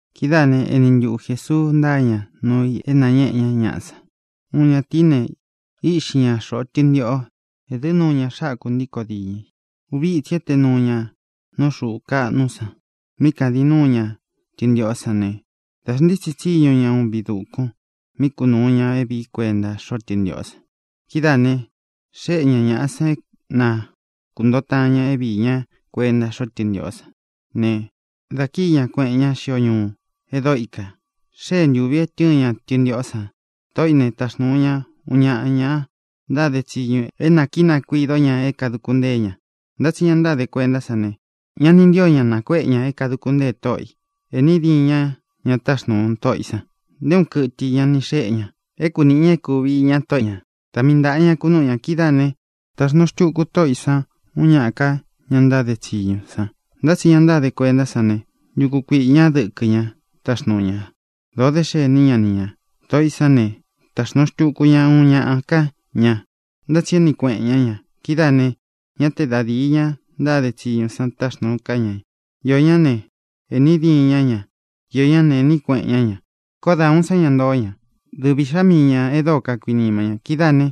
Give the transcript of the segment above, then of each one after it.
Kidáā né, eni ntuꞌu Jēsuu ntáa ña nuu i é nañéꞌē ñá ñaꞌa san: —Uun ñatīí ne, íꞌxi ña xoꞌo tɨntiꞌō. Ēdɨ́ nuu ña xákū ntíkō diñɨ i. Uvi ítsī éte nuu ña nú xuu kaꞌnu san mí kādin núu ña tɨntiꞌō sán ne, dā xntítsi tsíñu ña uun viꞌi dūkun mí kunūu ña é vīí kuenta xóꞌo tɨntiꞌō san. ʼKidáā ne, xéꞌe ña ñāꞌa san é na kūntoo taan ña é viī ña kuenta xóꞌo tɨntiꞌō sán ne, dā kíi ña, kueꞌen ñá xio ñuu e dóo ikā. Xée ntūvi é tɨ̄ɨn ña tɨntiꞌó san. Tōꞌó i ne, taxnūu ña uun ñaꞌa ña ntáde tsiñu é nā kínakuīdó ña é kāduku ntée ña. Ntá tsi ña ntáde kuentá san ne, ña ni ntío ña nakuéꞌe ña é kāduku ntée tóꞌo ī. Ēꞌní diīn ñá ña táxnūu tóꞌo ī san. Nté uun kɨtɨ i ña ni xéꞌe ña é kunīꞌi ña é kūvi iña tóꞌo ñā; da mii ntāꞌa ña kunúꞌu ña. Kidáā né, taxnūu xtuku tóꞌo ī san uun ñáꞌa ka ña ntáde tsiñu san. Ntá tsi ña ntáde kuentá san ne, ntuku kuiꞌī ñá dɨkɨ ña táxnūu ña. Dōo dé xení ña ni ñā. Tōꞌó i san ne, taxnūu xtuku ña uun ñaꞌa ká ña. Ntá tsi éꞌni kueꞌen ñá ña. Kidáā ne, ñá te da dīi ña ntáde tsiñu san táxnūu ká ña. Iō ñá ne, ēꞌní diīn ñá ña. Iō ñá ne, ēꞌní kueꞌen ñá ña. ʼKoó da ūun sá ña ntoo ña: dɨvi īꞌxá mii ñā e dóo kakuinima ña. Kidáā né,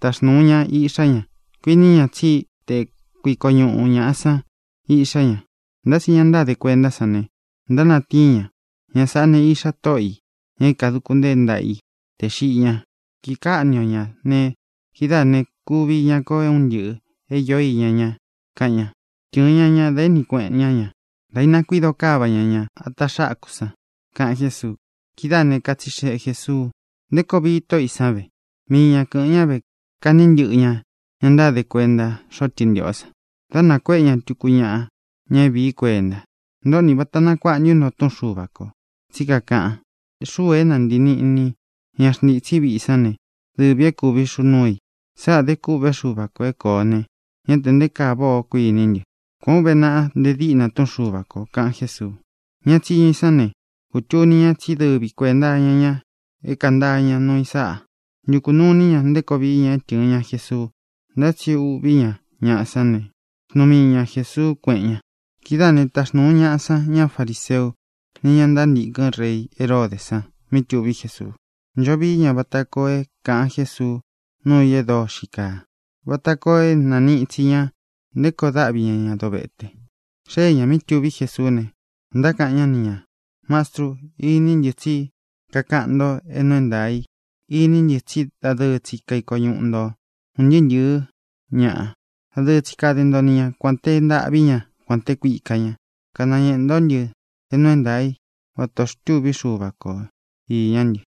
taxnūu ña iꞌxá ña. Kuiní ña tsí te kuiko ñūꞌu ñaꞌa san iꞌxá ña. Ntá tsi ña ntáde kuentá san ne, ntánatíin ña: “Ña sāꞌá ne, iꞌxa tóꞌo ī, ña é nākunteé ntaꞌa i tē xiꞌi ña. Kīkáꞌni o ñā ne, kidáā ne, kuvi iña ko un ntɨ́ꞌɨ̄ é īo iña ña”, kaꞌan ña. Tɨ̄ɨn ña ña, da éꞌni kueꞌen ñá ña, dā ínakuido káva ña ña ata xákū san —kaꞌan Jésuu. Kidáā ne, katsixeꞌe Jēsuu: —¿Nté koo vii tóꞌo ī san ve? Mii ña kɨ̄ꞌɨn ñá ve, kaꞌní ntɨꞌɨ ña ña ntáde kuenta xóꞌo tɨntiꞌō san, dá nakuéꞌe ña tuku ñaꞌa, ña é vīí kuenta. ʼNtōꞌó ni, ¿vāta nakuaꞌa ntu nto Túꞌun Xuva kō? Tsí kakaꞌan: Xúū é nāntii níꞌni ña xntîtsí viꞌi sán ne, dɨvī é kūvi xuu núu i. Sáꞌā dé kûꞌvé Xuva kō é kōo ne, ñá tē nté kaa váꞌā ó, kuiní ntɨ. Kuān ó uve naꞌa nte diꞌna Túꞌun Xuva kō —kaꞌan Jésuu. Ña tsiñu i sán ne, kūtuni ña tsí dɨvi kuēnta iña ñá é kāntáa ña nuu i sáꞌa. Ntukū nuu iní ña nté koo vií ña é tɨ̄ɨn ña Jesuu. Ntá tsi uꞌví ña ñaꞌa sán ne, xnuu mii ña Jēsuu, kuéꞌen ñā. Kidáā ne, táxnūu ñaꞌa san ña fariseu ni ña ntántīkɨn rei Heródē san mí tuví Jesuu. Ncho vií ña vata koo é kāꞌan Jésuu nuu i e dóo xíi kaa, vata koo é nāniꞌi itsi ña nté koo dáꞌvi ña ña dovete. Xée ñā mí tuví Jesuú ne, ntákaꞌan ñá ni ñā: —Mastru, iní ntɨ tsí kakaꞌan nto é nuu é ntaā i. Iní ntɨ tsí dadɨɨ tsi kaiko ñuꞌu ntō un ntɨɨ́ ntɨ̄ɨ́ ñaꞌa, dadɨɨ tsi kade nto ni ña, kuān te ntaꞌví ña, kuān te kuika ña. Kanañēꞌe ntó ntɨ é nuu é ntaā í vata ō xtûví Xuva ko īñá ntɨ.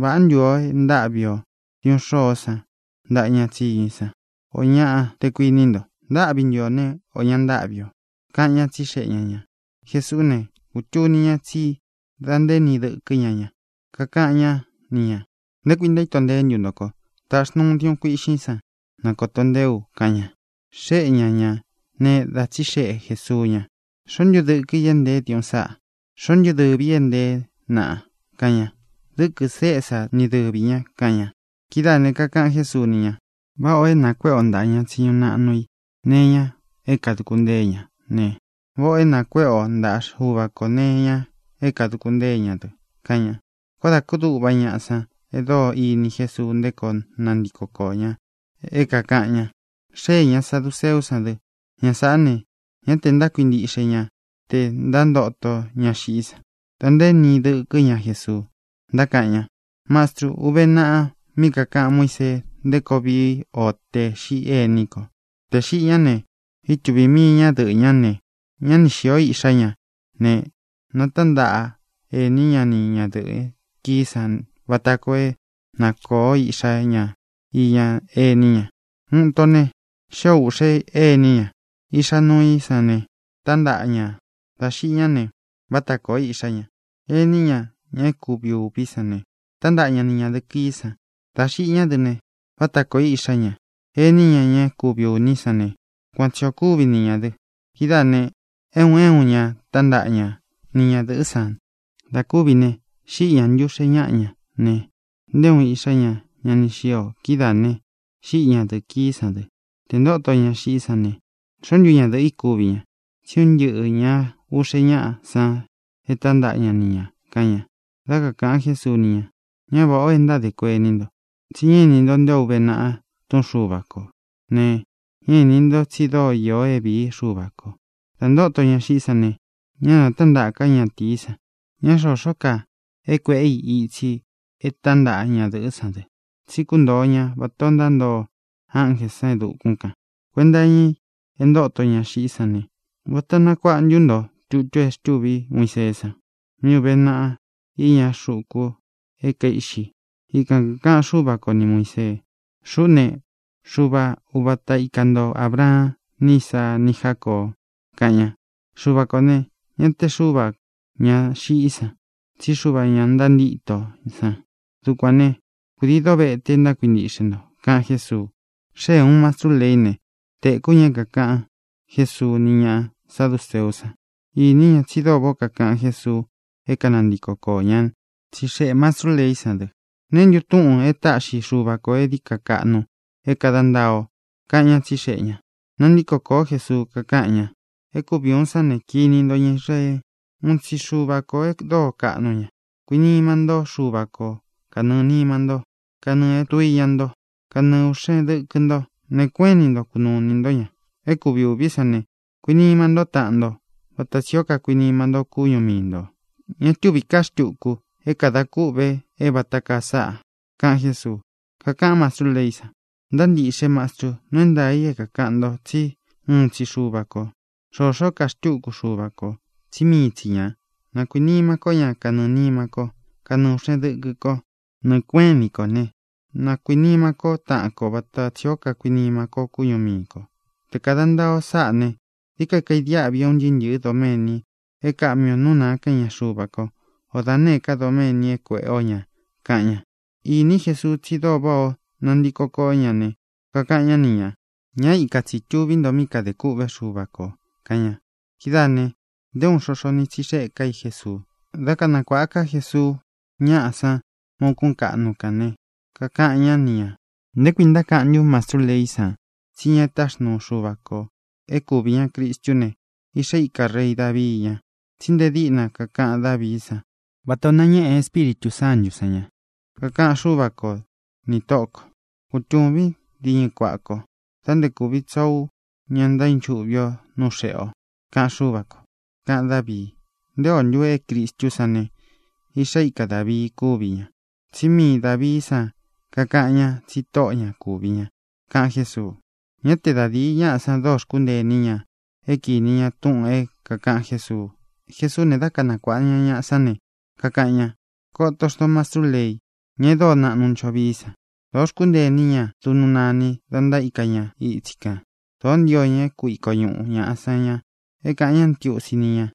¿Vāꞌá ntu ō é ntáꞌvi ō diuꞌun xôó san ntaꞌa ña tsiñu i san, ō ñaꞌa, te kuiní nto? ¿Ntáꞌvi ntu ō né, ō ña ntáꞌvi ō? —kaꞌan ñá, tsixeꞌe ña ñā. Jesuú ne, kūtuni ña tsí da ntaéni dɨkɨ́ ña ña. Kakaꞌan ñá ni ñā: —¿Nté kui ntaíto nteé ntu nto ko? Tāꞌxi nto uun diuꞌun kuiꞌxín san, na kōto nteé u —kaꞌan ña. Xéꞌe ña ñā ne, da tsíxeꞌe Jēsuu ña: —¿Xoó ntu dɨkɨ i é ntēé diuꞌun sáꞌa? ¿Xoó ntu dɨvī í e nteé naꞌa? —kaꞌan ña. —Dɨ́kɨ̄ Césa ni dɨvī ña —kaꞌan ña. Kidáā ne, kakaꞌan Jésuu ni ña: —Váꞌa ō é nākuéꞌe o ntāꞌa ña tsiñu naꞌnu i nee iña é kāduku ntée ña ne, váꞌa ō é nākuéꞌe o ntaꞌa Xuva kō nee iña é kāduku ntée ña dɨ —kaꞌan ña. Koó dā kúduꞌva ñaꞌa san e dóo ini Jesuu nté koo nantiko koō ña é kākaꞌan ña. Xéē ña saduceú san dɨ. Ña sāꞌá ne, ñá tē ntákuintiꞌxe ña tē ntántoto ña xiꞌí san. Da ntaéni dɨkɨ́ ña Jesuu, ntákaꞌan ña: —Mastrû, uve naꞌa mí kakāꞌan Muísee nté koo vií o tē xiꞌí ení kō. Tē xiꞌi ñá ne, ítuvī mii ñadɨꞌɨ́ ña ne, ña ni xīó iꞌxá ña ne, nātántaꞌa ení ña ni ñadɨ̄ꞌɨ kií san vata koo é na kōo iꞌxá ña iña ení ña. Uun ito ne, xío ūꞌxe ení ña. Iꞌxá nuu í san ne, tāntaꞌa ña. Dā xiꞌi ñá ne, váta kōó iꞌxá ña. Ení ña, ña é kuvi ūví san ne, tantaꞌa ña ni ñadɨ̄ꞌɨ kií san. Dā xiꞌi ñá dɨ ne, váta kōó iꞌxá ña. Ení ña, ña é kuvi ūní san ne, kuan tsi ō kúvi ni ñā dɨ. Kidáā ne, é un é un ña tántaꞌa ña ni ñadɨ̄ꞌɨ́ san. Dā kúvi ne, xíꞌi ña ntɨꞌɨ ūꞌxe ñáꞌa ña ne, nté uun iꞌxá ña ña ni xío. Kidáā ne, xíꞌi ñadɨ̄ꞌɨ kií san dɨ. Tē ntóto ña xiꞌí san ne, ¿xoó ntu ñadɨ̄ꞌɨ́ i kuvi ña? Tsí un ntɨꞌɨ̄ ña uꞌxe ñáꞌa san e tántaꞌa ña ni ñā —kaꞌan ña. Dá kakāꞌan Jésuu ni ña: —Ñá vāꞌá ō e ntádē kuení nto, tsi ñá ini nto nté o uve naꞌa Túꞌun Xuva kō ne, ñá īni nto tsi dóo īo é vīí Xuva kō. Dá ntōto ña xiꞌí san ne, ñá nātántaꞌa ká ñatīí san. Ña xoxó ka é kuēꞌé i itsi é tantaꞌa ñadɨ̄ꞌɨ́ san dɨ. Tsí kuntoo ña vatā ó ntántoo ánjē san e dukún kān. Kuenta iña i e ntóto ña xiꞌí san ne, ¿vāta nakuaꞌa ntu nto tutu e xtûví Muiseé san, mí uve naꞌa iña xuku é kaiꞌxi? Ikan kākaꞌan Xúva ko ni Muīsee: “Xuꞌú ne, Xuva uvata ika nto Ābraan ni Ísaa ni Jácoo”, kaꞌan ña. Xuva kō ne, ñá te Xuvā ñá xiꞌí san, tsí Xuvā ñá ntantíto san. Dukuān né, kūdii dovete ntákuintiꞌxe nto —kaꞌan Jésuu. Xée ūun mastrú leí ne, tēkú ña é kākaꞌan Jésuu ni ñá saduceú san. Īní ña tsi dóo váꞌā ó kakaꞌan Jésuu é kanantiko koō ña. Tsixeꞌē mastrú leí san dɨ: —¿Neé ntu túꞌūn e táꞌxi Xuva kō é dií ka kaꞌnu é kāda ntaa o? —kaꞌan ñá, tsixeꞌe ñā. Nantíko kōó Jesuu, kakáꞌan ña: —É kuvi ūun sán ne: “Kiní nto, ña Israee: uun tsi Xuva kō e dóo kaꞌnu ña. Kuinima ntó Xuva ko kanɨɨ̄ nima ntó, kanɨɨ̄ é tduiña nto, kanɨɨ ūꞌxen dɨkɨ nto. Nɨɨ̄ kuéꞌen ini nto kunuu inī ntó ña.” É kuvi ūví san ne: “Kuinima ntó taꞌan nto vata tsī ó kakuinima ntó kúñu mii ntō.” Ña túvī ká xtuku é kadā kûꞌve é vata kaa sáꞌa —kaꞌan Jésuu. Kakaꞌán mastrú leí san: —Ntáa ntīꞌxe, Mastru. Nuu é ntaā i é kākaꞌan nto, tsi úun tsi Xuva kō. Xoxó ka xtúku Xuva kō, tsí mii tsi ñā. Na kuīnima kó ña kanɨɨ̄ nima kó, kanɨɨ ūꞌxen dɨkɨ ko, nɨɨ kuéꞌen ini kō ne, na kuīnima kó taꞌan ko vata tsī ó kakuinima kó kúñu mii kō. Tē kada ntaa o sáꞌā ne, dií ka kaidiáꞌvi é un ntɨɨ́ ntɨ̄ɨ́ doméni é kāꞌmi o nú nāa kan íña Xuva ko, o da nēé ka doméni é kuēꞌé o ñā —kaꞌan ña. Iní Jesuu tsi dóo váꞌā ó nantiko koó ña ne, kakaꞌan ñá ni ñā: —Ña íka tsi tūví nto mí kadē kûꞌvé Xuva kō —kaꞌan ña. Kidáā ne, nté uun xoxo ni tsixeꞌe ká i Jesuu. Dá kanakuāꞌa ká Jesuu ñaꞌa san má ūkún kaꞌnu kān né, kakaꞌan ñá ni ñā: —¿Nté kui ntákaꞌan ntu mastrú leí san tsí ña é taxnuu Xuva kō é kuvi ña Cristú ne, iꞌxa íka rei Dāvii ña? Tsí nte díꞌna kakaꞌan Dávií san vata ō nañéꞌe Espíritū Sántū san ña: Kakaꞌan Xúva ko nī Tóꞌō ko: “Kutūvín diñɨ kuaꞌa ko da nté kūvi tsoo ú ña ntaínchuꞌvi ō nú xēꞌe o”, kaꞌan Xúva kō, kaꞌan Dávii. ¿Nté ō ntu é Cristú san ne, iꞌxá ika Dāvii kúvi ña? Tsí mii Dāvií san kakaꞌan ñá tsi Tóꞌo ñā kúvi ña —kaꞌan Jésuu. Ñá te da dīi ñaꞌá san dóo xkúntee iní ña é kīni ña túꞌūn é kākaꞌan Jésuu. Jesuú ne, dá kanakuāꞌa ña ñaꞌa sán ne, kakaꞌan ña: —Koto xnto mastrú lei, ñá e dóo naꞌnu ncho vií san. Dōó xkuntée iní ña duꞌnu nani da ntaíka ña itsi kān. Dōó ntio ña é kuiko ñuꞌu ñāꞌa san ña, é kāꞌan ñá ntiusi ní ña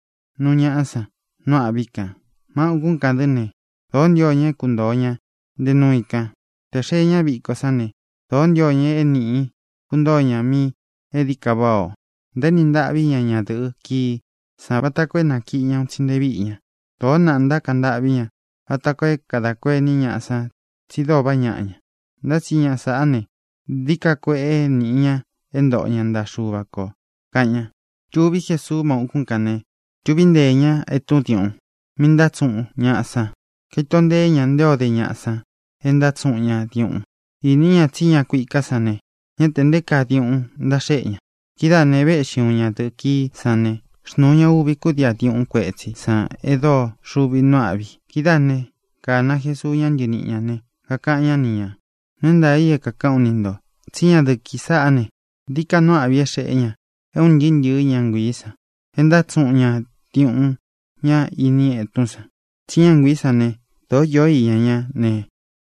núu ñaꞌa san nu âꞌví kān. Má ūkún kān dɨ́ ne, dōó ntio ña é kuntōo ña nte nuu i kan. Tē xee ñá viko sán ne, dōó ntio ña é nīꞌi kuntoó ña míꞌī e dií ka váꞌā o. Ntaéni ntáꞌvi ña ñadɨ̄ꞌɨ kií san vata koo é nakiꞌi ña un tsi nte víꞌi ña. Dōó naꞌa ntákaꞌan ntâꞌví ña, vata koo é kadā kuení ñaꞌa san tsi dóo vaꞌá ñaꞌa ña. Ntá tsi ña sāꞌá ne, dií ka kueꞌe níꞌi ña é ntoꞌo ña ntaꞌa Xuva kō —kaꞌan ña. Tuví Jesuu má ūkún kān ne, tuví nteē ña etún diuꞌun mí ntátsuꞌun ñaꞌa san. Kaito ntee ña nté o de ñaꞌa san é ntátsuꞌun ña diuꞌun. Īni ña tsí ña kuiká san ne, ñá tē nté kaa diuꞌun ntáxeꞌé ña. Kidáā ne, véꞌxi uun ñadɨ̄ꞌɨ kií san ne, xnūu ña uvi kúdii á diuꞌun kuetsí san e dóo xuvi nuu áꞌvi. Kidáā né, kāna Jesuu ña ntɨníꞌi ñā ne, kakaꞌan ñá ni ñā: —Nuu é ntaā i é kākaꞌán u ni ntō: Tsí ñadɨ̄ꞌɨ kií sāꞌá ne, dií ka nuu áꞌvi é xēꞌé ña é ūn ntɨɨ́ ntɨ̄ɨ́ ña nguiī san e ntátsuꞌun ña diuꞌun ña ini etún san. Tsí ña nguiī sán ne, dōó īó iña ñá ne,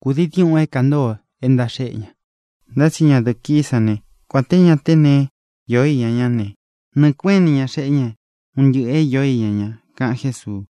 kūdii diuꞌun é kāntoo e ntáxeꞌé ña. Ntá tsi ñadɨ̄ꞌɨ kií san ne, kuān té ña te neé īó iña ñá ne, nɨɨ̄ kuéꞌen ini ña xeꞌé ña un ntɨꞌɨ̄ é īó iña ña —kaꞌan Jésuu.